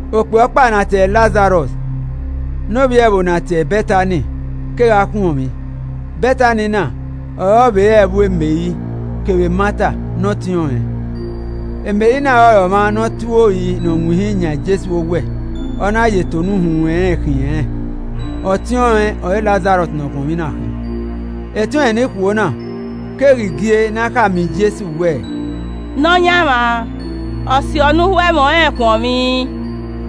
Okpia ọkpa ne a tie ẹre Lazarọs ne ovbi ẹvbo ne a tie ẹre Bẹtani kegha khuọnmwi, Bẹtani na ọre ọ vbe re ẹvbo Meri kevbe Mata ne ọtiọnrẹn. ( Meri na ọrọre ọmwa nọ ọ tue ori ne ọ winhin yan Jesu owẹ ọ na ye eto ne uhunmwu ẹnrẹn khiẹn rẹn, ọtiọnrẹn ọre Lazarọs ne ọkhuọnmwi na khin.) Etiọnrẹn ni ikhuo na, keghi gie ne a khama Jesu wẹẹ, “Nọyaẹnmwa, ọ siọ ne u ho ẹmwẹ ọnrẹn khuọnmwi.”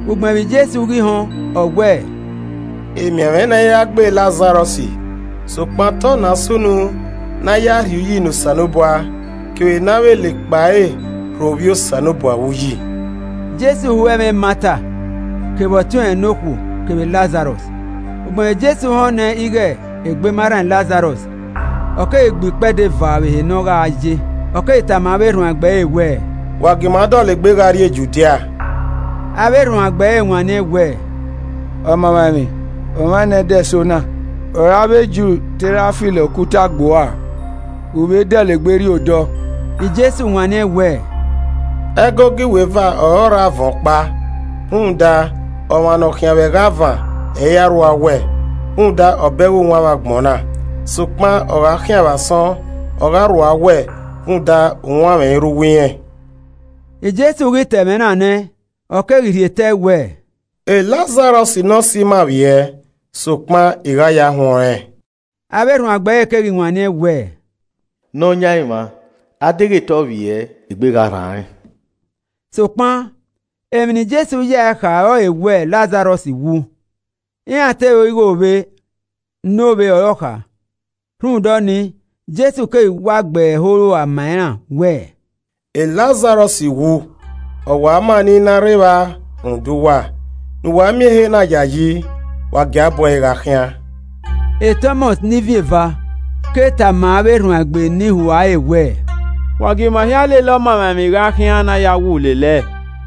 Ugbẹn vbe Jesu ghi họn, ọ wẹẹ, “Emianmwẹ na i ra gbe Lazarọs, sokpan te ọna sunu ne a ya ẹe rhie uyi ne Osanobua, kevbe ne a vbe la ekpa ẹre rho Ovbi Osanobua vbe uyi.” Jesu ho ẹmwẹ Mata kevbe ọtiọnrẹn ne okhuo kevbe Lazarọs. Ugbẹn vbe Jesu họn nẹ ighe egbe ma rran Lazarọs, ọ keghi gbe ikpẹdẹ eva vbe ehe ne ọ gha ye. Ọ keghi tama avbe erhuanegbe ẹre wẹẹ, “Wa gie ima dọlegbe gha rhie Judia.” Avbe erhuanegbe ẹre wanniẹn wẹẹ, “Ọmamwaemwi. omwa enẹdẹso na ọre avbe Ju te ra filo okuta gbe uẹ ua, u vbe dọlegbe rrie odọọ?” Jesu wanniẹn wẹẹ, “Ẹgogo iweva ọre ọ rre avan ọkpa. Rhunmwuda ọmwa ne ọ khian vbe ẹghẹ avan ẹ i ra rrua owẹ, rhunmwuda ọ bẹghe uwanmwẹ agbọn na. Sokpan, ọ gha khian vbe asọn, ọ gha rrua owẹ, rhunmwuda uwanmwẹ i rre uwu irẹn.” Jesu ghi ta ẹmwẹ na nẹ, ọ keghi rrie te ẹe wẹẹ, “Lazarọs ne ọse ima vbiẹ, sokpan I gha yo ya huẹn ọnrẹn.” Avbe erhuanegbe ẹre keghi wanniẹn wẹẹ, “Nọyaẹnmwa, a deghẹ te ọ vbiẹ, egbe gha rran rẹn.” Sokpan emwi ne Jesu yae kha ọrọre wẹ Lazarọs wu, iran te ro ighe ovbe ne ovbe ọre ọ kha. Rhunmwuda ọnii, Jesu keghi wa gbe ẹre ẹho ua ma iran wẹẹ, “Lazarọs wu! Ọ wa ma ne I i na rre evba rhunmwuda uwa, ne uwa miẹn ehe na yayi. Wa gie a bu ẹre gha khian.” Tọmọs (ne Ivin Eva) ke tama avbe erhuanegbe ne ihua ẹre wẹẹ, “Wa gie ima hia lele Ọmamwaemwi gha khian ne a ya wu lele ẹe!”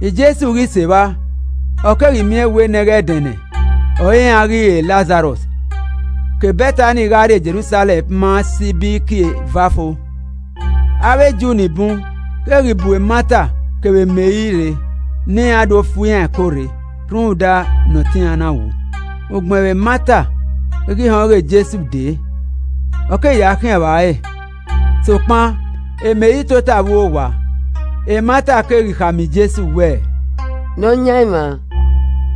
Jesu ghi sẹ evba, ọ keghi miẹn wẹ nẹghẹdẹnẹ ọre iran ghi ree Lazarọs. Ke Bẹtani gha rrie Jerusalẹm ma sẹ Ibiriki eva fo. Avbe Ju ni bun keghi bu Mata kevbe Meri rre ne iran do fu iran ẹko rre rhunmwuda ne ọtẹn iran na wu. Ugbẹn vbe Mata ghi họn ighe Jesu dee, ọ keghi ya khian vba ẹre, sokpan Meri tota vbe uwu owa. Mata keghi khama Jesu wẹẹ, “Nọyaẹnmwa,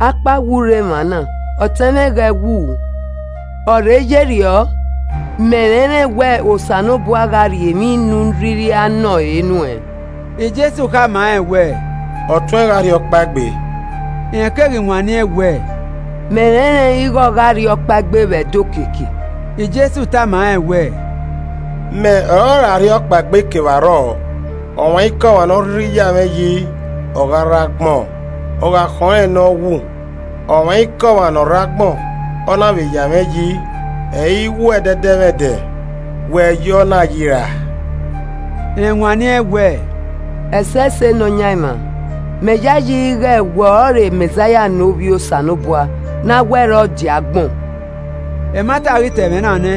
akpawẹ u rre emwa na, ọtẹn mwẹ ghẹ wu. Ọ rhe ye rriọ, mẹ rẹnrẹn wẹ Osanobua gha rhie emwi ne u rhirhi a nọ ọn ẹre re nuẹn.” Jesu khama rẹn wẹẹ, “Ọtuẹn gha rhiọkpaegbe.” Rẹn keghi wanniẹn wẹẹ, “Mẹ rẹnrẹn ighe ọ gha rhiọkpaegbe vbe ẹdẹ okiekie.” Jesu tama rẹn wẹẹ, “Mẹ ọrọre arhiọkpaegbe kevbe arrọọ, ọmwaikọmwa ne ọ rhirhi a ya mwẹ yi, ọ gha rre agbọn, ọ gha khọn rẹn ne ọ wu. Ọmwaikọmwa ne ọ rre agbọn, ọ na vbe ya mwẹ yi, ẹ i wu ẹdẹdẹmwẹdẹ, wẹ ya ọna yi ra?” Rẹn wanniẹn wẹ, “Ẹsẹse Nọyaẹnmwa, Mẹ yayi ighe wẹ ọrọre Mẹzaia ne Ovbi Osanobua ne a wẹ re ọ die agbọn.” Mata ghi ta ẹmwẹ na nẹ,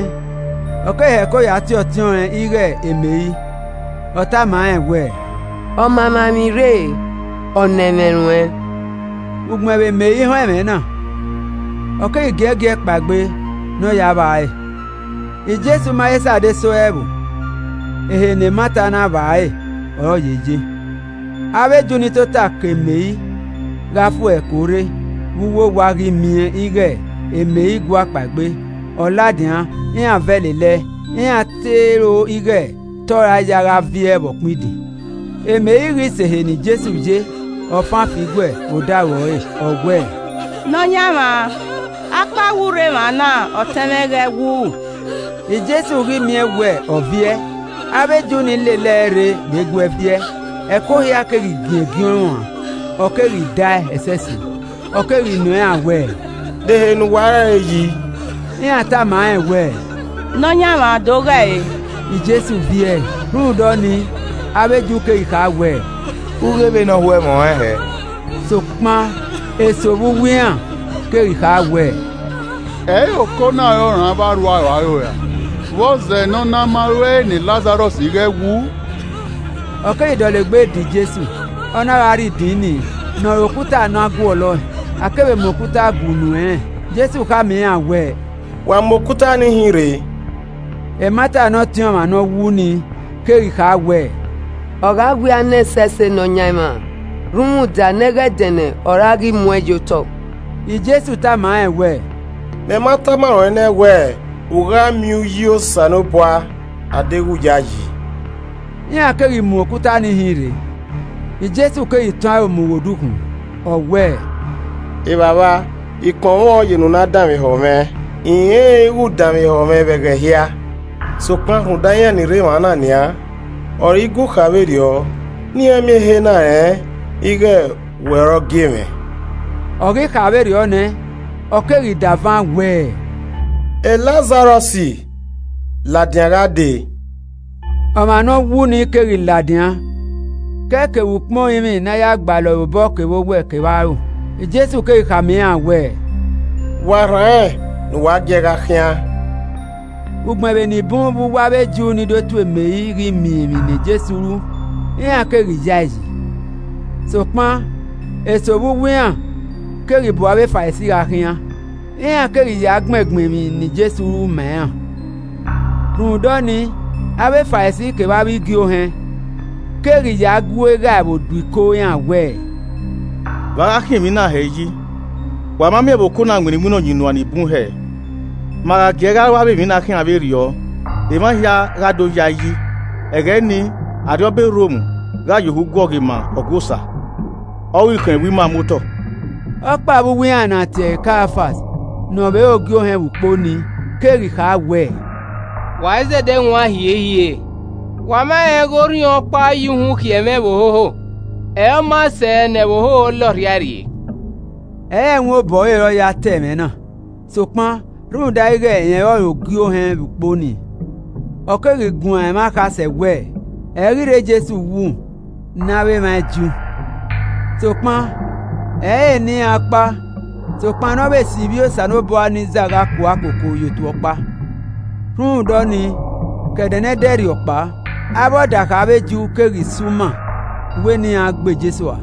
ọ keghi heko ya tie ọtiọnrẹn ighe Meri, ọ tama rẹn wẹẹ, “Ọmamwaemwi rre, ọ nọ ẹmwẹ ruẹn.” Ugbẹn vbe Meri họn ẹmwẹ na, ọ keghi giẹgiẹ kpaegbe ne ọ ya vba ẹre. (Jesu ma he sẹ adesẹ ẹvbo, ehe ne Mata na vba ẹre ọre ọ ye ye.) Avbe Ju ni tota ke Meri gha fu ẹre ẹko rre vbe uwu owa ghi miẹn ighe Meri gua kpaegbe, ọ ladian, iran vẹ lele ẹe. Iran te ro ighe te ọ ra ya gha viẹ vbe ọkpẹn idin. Meri ghi sẹ ehe ne Jesu ye, ọ fan fi igue vbe odaro ẹre, Ọ wẹẹ, “Nọyaẹnmwa, akpawẹ u rre emwa na, ọtẹn mwẹ ghẹ wu!” Jesu ghi miẹn wẹ, ọ viẹ, avbe Ju ni lele ẹe rre vbe guee viẹ, ẹko hia keghi giẹngiẹn ọẹn ruan, ọ keghi dae ẹsẹse. Ọ keghi nọ iran wẹẹ, “De ehe ne uwa re ẹre yi?” Iran tama rẹn wẹẹ, “Nọyaẹnmwa do ghe ẹre.” Jesu viẹe Rhunmwuda ọnii avbe Ju keghi kha wẹẹ, “U ghe vbe ne ọ ho ẹmwẹ ọnrẹn hẹ.” Sokpan eso vbe uwu iran keghi kha wẹẹ, “Ẹ i re oko na ọre ọ rhan avbe arhuaro aro ra? Vbọzẹ ne ọ na ma ruẹe ne Lazarọs ghẹ wu?” Ọ keghi dọlegbe da Jesu, ọ na gha rrie idin ni ne ọre okuta ne a guọlọe, a kevbe mu okuta gue unu ẹnrẹn. Jesu khama iran wẹ, “Wa mu okuta nii hin rre!” Mata ne ọtẹn ọmwa ne ọ wu nii keghi kha wẹẹ, “Ọ gha wia nẹ ẹsẹse Nọyaẹnmwa rhunmwuda nẹghẹdẹnẹ ọre a ghi mu ẹn ye otọ!” Jesu tama rẹn wẹẹ, “Mẹ ma tama ruẹn nẹ wẹẹ u gha miẹn uyi Osanobua adeghẹ u yayi.” Iran keghi mu okuta nii hin rre. Jesu keghi tọn aro mu ghe odukhunmwu, ọ wẹẹ, “Evbavba, I kpọnmwẹ ọn ye ne u na danmwehọ mwẹ. I rẹnrẹn ighe u danmwehọ mwẹ vbe ẹghẹ hia, sokpan rhunmwuda iran ni rre emwa na nian, ọ re I gu kha vberriọ ne iran miẹn ehe na rẹn ighe wẹ ọre ọ gie mwẹ.” Ọ ghi kha vberriọ nẹ, ọ keghi davan wẹẹ, “Lazarọs ladian gha dee!” Ọmwa ne ọ wu nii keghi ladian ke ẹe kevbe ukpọn orinmwi ne a ya gbalọ ẹre obọ kevbe owẹ kevbe aro. Jesu keghi khama iran wẹ, “Wa rhan rẹn ne u wa gie ẹe gha khian.” Ugbẹn vbe ni bun vbe uwu avbe Ju ni do tuẹ Meri ghi miẹn emwi ne Jesu ru, iran keghi ya ẹe yi. Sokpan eso vbe uwu iran keghi bu avbe Farisi gha khian, iran keghi ya gbẹngbẹn emwi ne Jesu ru ma iran. Rhunmwuda ọnii, avbe Farisi kevbe avbe igie ohẹn keghi ya gu Eghaẹvbo do iko iran wẹ, “Vbe a gha khian emwi na hẹ yi, wa ma miẹn vbe oko na winna iwinna ọyunnuan ni bun hẹe! Ma gha gie ẹe gha ru avbe emwi na khian vberriọ, emwa hia gha do ya ẹe yi, ẹghẹ nii, arriọba e Rom gha ye ohu guọghọ ima Ọgua Osa, ọ ghi khọn ẹvbo ima muotọ.” Ọkpa vbe uwu iran ne a tie ẹre Kaiafas ne ọ vbe re ogie ohẹn vbe ukpo nii keghi kha wẹẹ, “Wa izẹdẹ wan hiehie re. Wa ma rẹn ighẹ orhiọnkpa ya uhunmwu khiọ ẹmwẹ ẹvbo hoho ọre ọ maa sẹ ne ẹvbo hoho la ọrhiae rrie.” (Ẹ i re ẹwaẹn obọ ẹre ọre ọ ya ta ẹmwẹ na, sokpan, rhunmwuda ighẹ rẹn ọrọre Ogie Ohẹn vbe ukpo nii, ọ keghi guan ẹmwẹ akhasẹ wẹ, ẹ i ghi rre Jesu wu ne avbe emwa Ju. Sokpan ẹ i re ne iran ọkpa, sokpan ne ọ vbe si ivbi Osanobua ni zagha kua koko ye otu ọkpa.) Rhunmwuda ọnii, ke ẹdẹ ne ẹdẹrriọ kpao, avbe ọdakha avbe Ju keghi si uma wẹ ne iran gbe Jesu ua.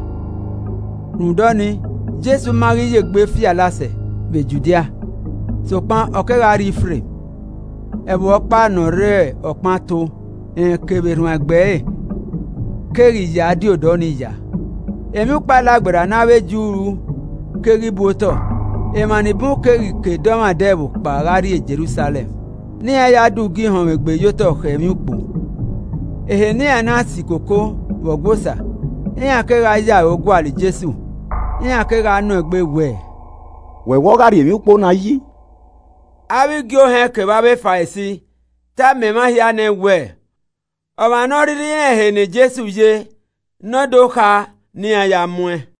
Rhunmwuda ọnii, Jesu ma ghi ye egbe fi alasẹ vbe Judia, sokpan ọ kegha rrie Ifreim, ẹvbo ọkpa ne ọ rre ọkpẹn ato, rẹn kevbe erhuanegbe ẹre keghi ya die odọ nii ya. Emwiukpo Alagberra ne avbe Ju ru keghi bu otọ, emwa ni bun keghi ke dọmwadẹ ẹvbo kpao gha rrie Jerusalẹm ne iran ya do ugie ihọnmwegbe ye otọ khẹ emwiukpo. Ehe ne iran na si koko vbe Ọgua Osa, iran kegha ya aro gualọ Jesu, iran kegha nọ egbe wẹ, “Wẹ wẹ ọ gha rri emwiukpo na yi?” Avbe igie ohẹn kevbe avbe Farisi tama emwa hia nẹ wẹẹ, ọmwa ne ọ rhirhi rẹn ehe ne Jesu ye, ne ọ do kha ne iran ya mu ẹn.